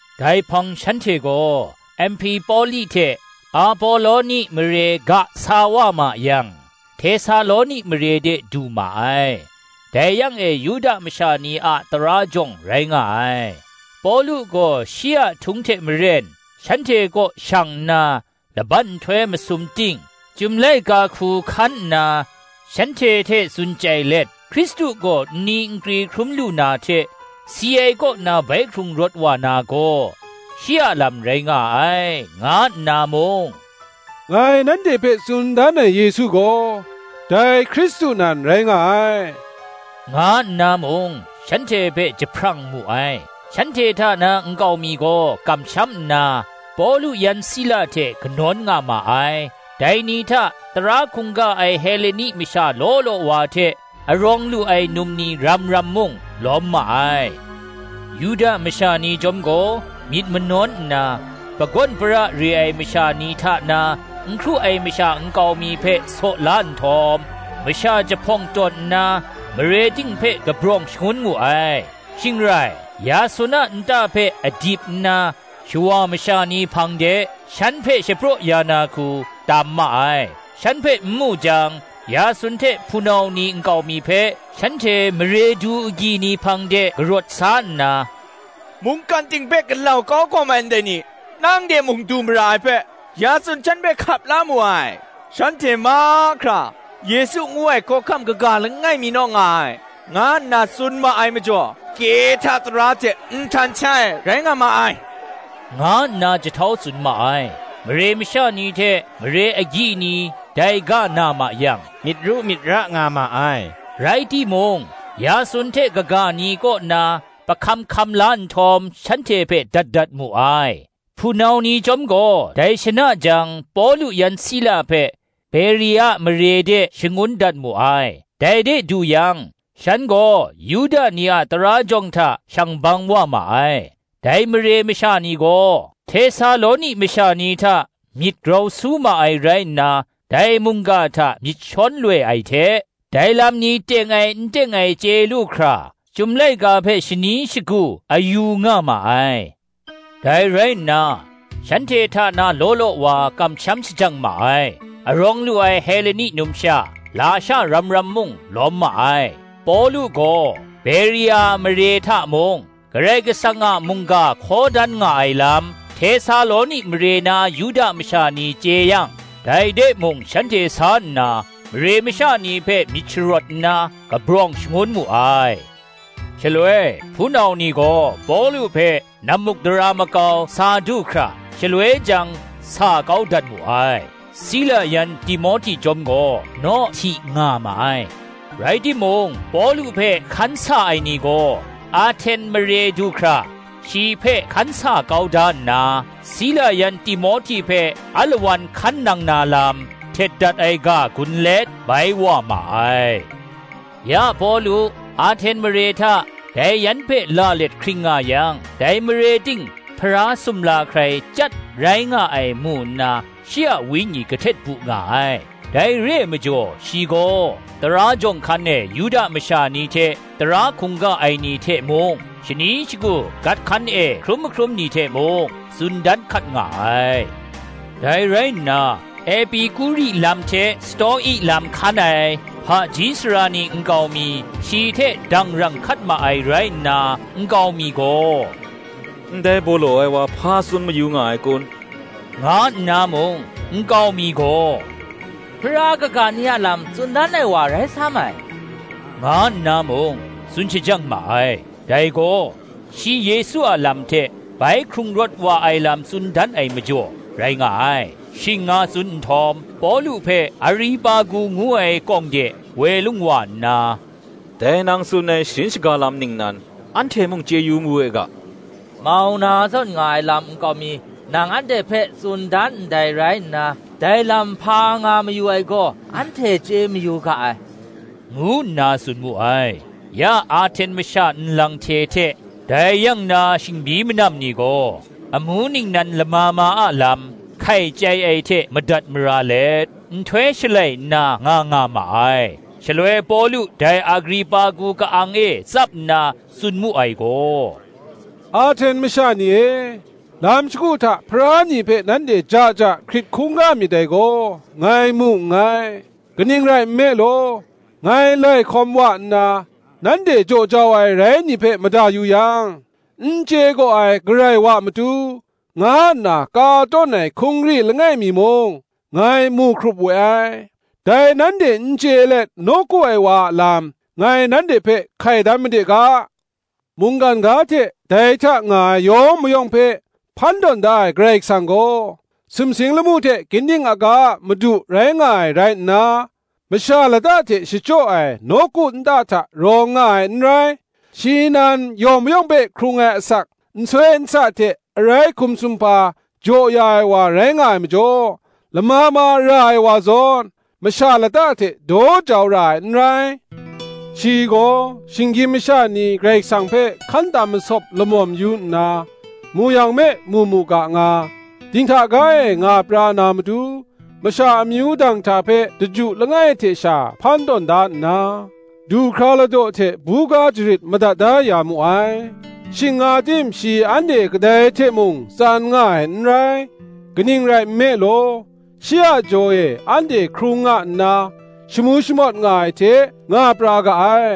Dai hpang shanhte gaw Amhpipoli hte Apoloni mare ga sa wa ma yang, Htesaloni mare de du ma ai; dai yang e Yuda masha ni a tara jawng rai nga ai. Pawlu gaw shi a htung hte maren, shanhte kaw shang nna, Laban nhtoi masum ting, Chyum laika hku hkan nna shanhte hte tsun chyai let, Hkristu gaw nni nkri hkrum lu na hte, si ai kaw na bai hkrung rawt wa na gaw, shi a lam rai nga ai, nga nna mung, Ngai nanhte hpe tsun dan ai Yesu gaw, dai Hkristu nan rai nga ai, nga nna mung, shanhte hpe jahprang mu ai. Shanhte hta na nkau mi gaw kamsham nna, Pawlu yan Sila hte kanawn nga ma ai; dai ni hta, tara hkungga ai Heleni masha law law wa hte, arawng lu ai num ni ram ram mung, lawm ma ai. Yuda masha ni chyawm gaw myit manawn nna, pagawn para re ai masha ni hta na n hkru ai masha nkau mi hpe saw la nhtawm, masha jahpawng tawn nna, mare ting hpe kabrawng shangun mu ai; shing rai, Yasun a nta hpe adip nna, shawa masha ni hpang de shan hpe shapraw ya na hku, tam ma ai, Shan hpe n mu jang, Yasun hte hpunau ni nkau mi hpe, shanhte mare du gyi ni hpang de karawt sa nna, “Mungkan ting hpe galau kau hkawm ai ndai ni, nang de mung du mara ai hpe, Yasun shan hpe hkap la mu ai: shanhte mahkra, Yesu ngu ai hkawhkam kaga langai mi naw nga ai, nga nna tsun ma ai majaw, Kehta tara hte nhtan shai ai, rai nga ma ai,” nga nna jahtau tsun ma ai, Mare masha ni hte mare agyi ni dai ga na ma yang, myit ru myit ra nga ma ai. Rai timung, Yasun hte kaga ni kaw na pahkam hkam la nhtawm, shanhte hpe dat da mu ai. Hpunau ni chyawm gaw dai shana jang, Pawlu yan Sila hpe Beria mare de shangun dat mu ai; dai de du yang, shan gaw Yuda ni a tara jawng hta shang bang wa ma ai. Dai mare masha ni gaw Htesaloni masha ni hta myit grau su ma ai rai nna, dai mungga hta myit shawn loi ai hte, dai lam ni teng ai n teng ai chye lu hkra, Chyum laika hpe shani shagu a yu nga ma ai. Dai rai nna, shanhte hta na law law wa kamsham shajang ma ai; arawng lu ai Heleni numsha, lasha ram ram mung, lawm ma ai. Pawlu gaw Beria mare hta mung, Karai Kasang a mungga hkaw dan nga ai lam, Htesaloni mare na Yuda masha ni chye yang, dai de mung shanhte sa nna, mare masha ni hpe myit sharawt nna, kabrawng shangun mu ai. Shaloi hpunau ni gaw Pawlu hpe nammukdara makau sa du hkra, shaloi jang, sa kau dat mu ai; Sila yan Timohti chyawm gaw naw hti nga ma ai. Rai timung, Pawlu hpe hkan sa ai ni gaw, Ahten mare du hkra shi hpe hkan sa kau da nna, Sila yan Timohti hpe alawan hkan nang na lam, htet dat ai ga gun let, bai wa ma ai. Ya Pawlu, Ahten mare hta dai yan hpe la let hkring nga yang, dai mare ting Hpara sumla hkrai chyat rai nga ai mu nna, shi a wenyi kahtet bu nga ai. Dai re ai majaw shi gaw, tara jawng hkan e Yuda masha ni hte tara hkungga ai ni hte mung, shani shagu gat hkan e hkrum mahkrum ni hte mung, tsun dan hkat nga ai. Dai rai nna, Epikuri lam hte Sto-i lam hkan ai hpaji sara ni nkau mi, shi hte dangrang hkat ma ai rai nna, nkau mi gaw, “Ndai baw law ai wa hpa tsun mayu nga ai kun?” nga nna mung, nkau mi gaw, “Hpara kaga ni a lam tsun dan ai wa rai sam ai,” nga nna mung, tsun shajang ma ai: dai gaw, shi Yesu a lam hte bai hkrung rawt wa ai lam tsun dan ai majaw rai nga ai. Shing nga tsun nhtawm, Pawlu hpe Aripagu ngu ai kawng de woi lung wa nna, “Dai nang tsun ai sharin shaga lam ningnan, anhte mung chye yu mawe ga? Mau na zawn nga ai lam nkau mi, nang anhte hpe tsun dan ndai rai nna, dai lam hpa nga mayu ai gaw, anhte chye mayu ga ai,” ngu nna tsun mu ai. (Ya Ahten masha nlang hte hte dai yang na shingbyi manam ni gaw, amu ningnan lama ma a lam, hkai chyai ai hte madat mara let, nhtoi shalai nna nga nga ma ai.) Shaloi Pawlu dai Aripagu ka-ang e tsap nna tsun mu ai gaw, “Ahten masha ni e, lam shagu hta Hpara ni hpe nanhte ja ja hkrit hkungga myit dai gaw, ngai mu nngai. Kaning rai nme law, ngai lai hkawm wa nna, nanhte jaw jau ai rai ni hpe mada yu yang, N chye gaw ai Karai Wa matu, nga nna ka tawn ai hkungri langai mi mung, ngai mu hkrup we ai: dai nanhte n chye let nawku ai wa a lam, ngai nanhte hpe hkai dan made ga, Mungkan ga hte dai hta nga ai yawng mayawng hpe, hpan tawn da ai Karai Kasang gaw, sumsing lamu hte ginding aga a Madu rai nga ai rai nna, masha lata hte shachyaw ai nawku nta hta rawng nga ai n rai: shi nan, yawng mayawng hpe hkrung ai asak, nsoi nsa hte arai hkum sumhpa jaw ya ai wa rai nga ai majaw, lama ma ra ai wa zawn masha lata hte daw jau ra ai n rai. Shi gaw, shinggyim masha ni Karai Kasang hpe hkan tam masawp lamawm yu nna, mu yang me mu mu ga nga, dinghta ga e nga pra na matu, masha amyu danghta hpe daju langai hte sha hpan tawn da nna, du hkra ladaw hte buga jarit madat da ya mu ai; shing nga tim shi anhte kadai hte mung tsan nga ai n rai: kaning rai nme law, shi a jaw e anhte hkrung nga nna, shamu shamawt nga ai hte nga pra ga ai.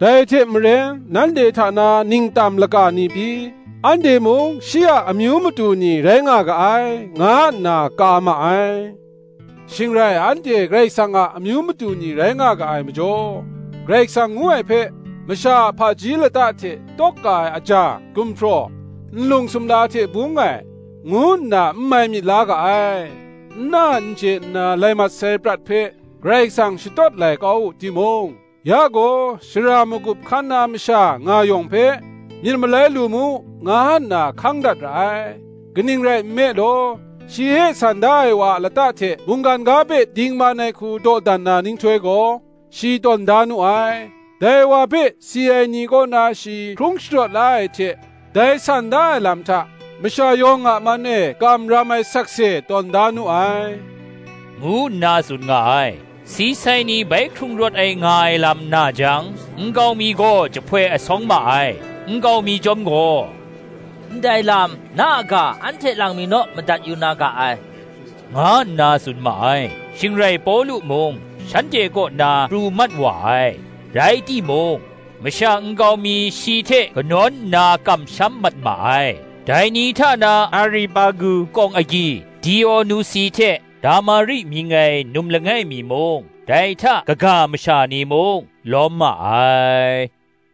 Dai hte maren, nanhte hta na ningtam laka ni pyi, ‘Anhte mung Shi a amyu matu ni rai nga ga ai,' nga nna ka ma ai. Shing rai, anhte Karai Kasang a amyu matu ni rai nga ga ai majaw, Karai Kasang ngu ai hpe, masha a hpaji lata hte tawk ka ai aja, gumhpraw, nlung sumla hte bung ai, ngu nna n mai myit la ga ai. N na n chye nna lai mat sai prat hpe, Karai Kasang shatawt lai kau wu timung, ya gaw, shara magup hkan na masha nga yawng hpe, myit malai lu mu, nga nna hkang dat ra ai: kaning rai nme law, shi e san da sai wa a lata hte mungkan ga hpe dingman ai hku dawdan na nhtoi gaw, shi tawn da nu ai: dai wa hpe si ai ni kaw na shi hkrung sharawt la ai hte, dai san da ai lam hta, masha yawng a man e kam ram ai sakse tawn da nu ai,” ngu nna tsun nga ai. Si sai ni bai hkrung rawt ai nga ai lam na jang, nkau mi gaw jahpoi asawng ma ai: nkau mi chyawm gaw, “Ndai lam, na a ga anhte lang mi naw madat yu na ga ai,” nga nna tsun ma ai. Shing rai Pawlu mung shanhte kaw na pru mat wa ai. Rai timung, masha nkau mi shi hte kanawn nna kamsham mat ma ai: dai ni hta na Aripagu kawng agyi Dionusi hte Damari mying ai num langai mi mung. dai hta kaga masha ni mung, lawm ma ai.